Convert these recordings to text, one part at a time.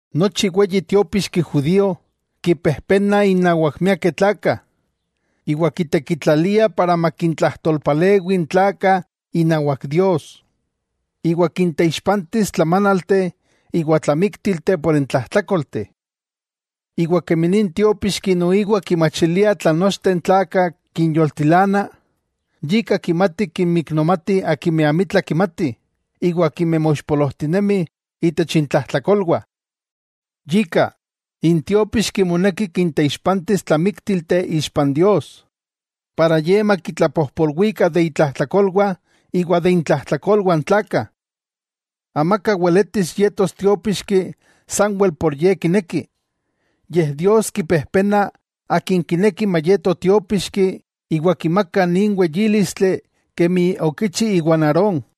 Nochi weyi tiópixki judío kipejpenah innawak miakeh tlakah, iwa kitekitlaliah para makintlajtolpalewi n tlakah inawak Dios, iwa kinteixpantis tlamánalteh iwa tlamíktilteh por n tlajtlákolteh. Kemi nin tiópixki noiwa kimachilia tlan nochteh n tlakah kinyoltilana, yika kimati kinmiknomati akimeh amitla kimatih iwa akimeh moixpolojtinemih itech intlajtlakolwah. Yika, n tiopíxki moneki kinteixpantis tlamíktilteh ixpa n Dios, para makitlapojpolwikah de itlajtlakolwah iwa de intlajtlakolwah n tlakah. Amaka weletis yetos tiópixki sanwel por ye kineki, yej Dios kipejpena akin kineki mayeto tiópixki iwa kimaka nin weyílistli kemi okichi iwa n Aarón.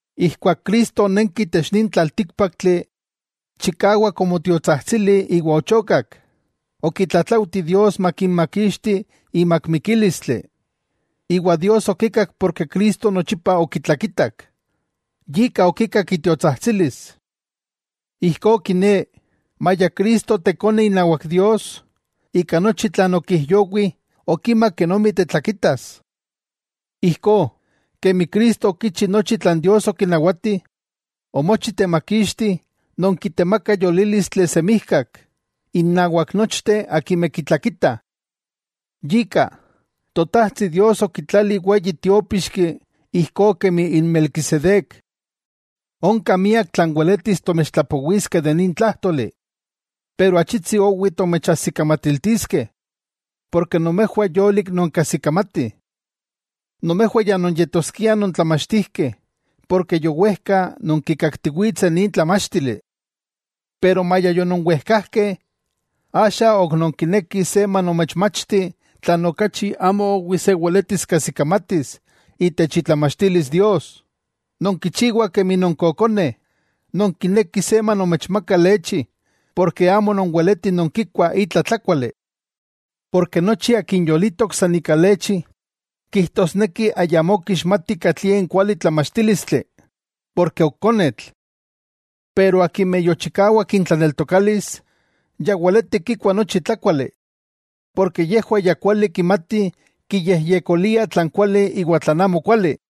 Ijkuak Cristo onenki itech nin tlaltíkpaktli, chikawak omotiotsajtsili iwa ochokak; okitlatlaujti Dios makimakixti imak mikílistli; iwa Dios okikak porke Cristo nochipa okitlakitak, yika okikak itiotsajtsilis. Ijkó kiné, maya Cristo Tekone inawak Dios, ika nochi tlan okijyowi okima kenomi tetlakitas. Ijkó, kemi Cristo okichi nochi tlan Dios okinawati, omochi temakixti non kitemakah yolílistli semijkak, innawak nochteh akimeh kitlakitah. Yika, Totajtsi Dios okitlali weyi Tiópixki ijkó kemi n Melquisedec. Onka miak tlan weletis tomechtlapowiskeh de nin tlájtoli, pero achitsi owi tomechajsikamatiltiskeh, ken nomejwah yolik nonkajsikamatih. Nomejwah ya nonyetoskiah nontlamachtijkeh ken yowejka nonkikaktiwitseh nin tlamáchtili. Pero maya yononwejkajkeh, axa ok nonkinekih se manomechmachti tlan okachi amo owi se weletis kajsikamatis itech itlamachtilis Dios. Nonkichiwah kemi nonkokoneh, nonkinekih se manomechmaka lechi ken amo nonweletih nonkikuah itla tlákuali. Porke nochi akin yolitok san ika lechi, kijtosneki ayamó kixmati katlie n kuali tlamachtílistli, ken ok konetl. Pero akimeh yochikawak intlaneltokalis, ya weletih kikuah nochi tlákuali, porke yejwah ya kuali kimatih kiyejyekoliah tlan kuali iwa tlan amokuali.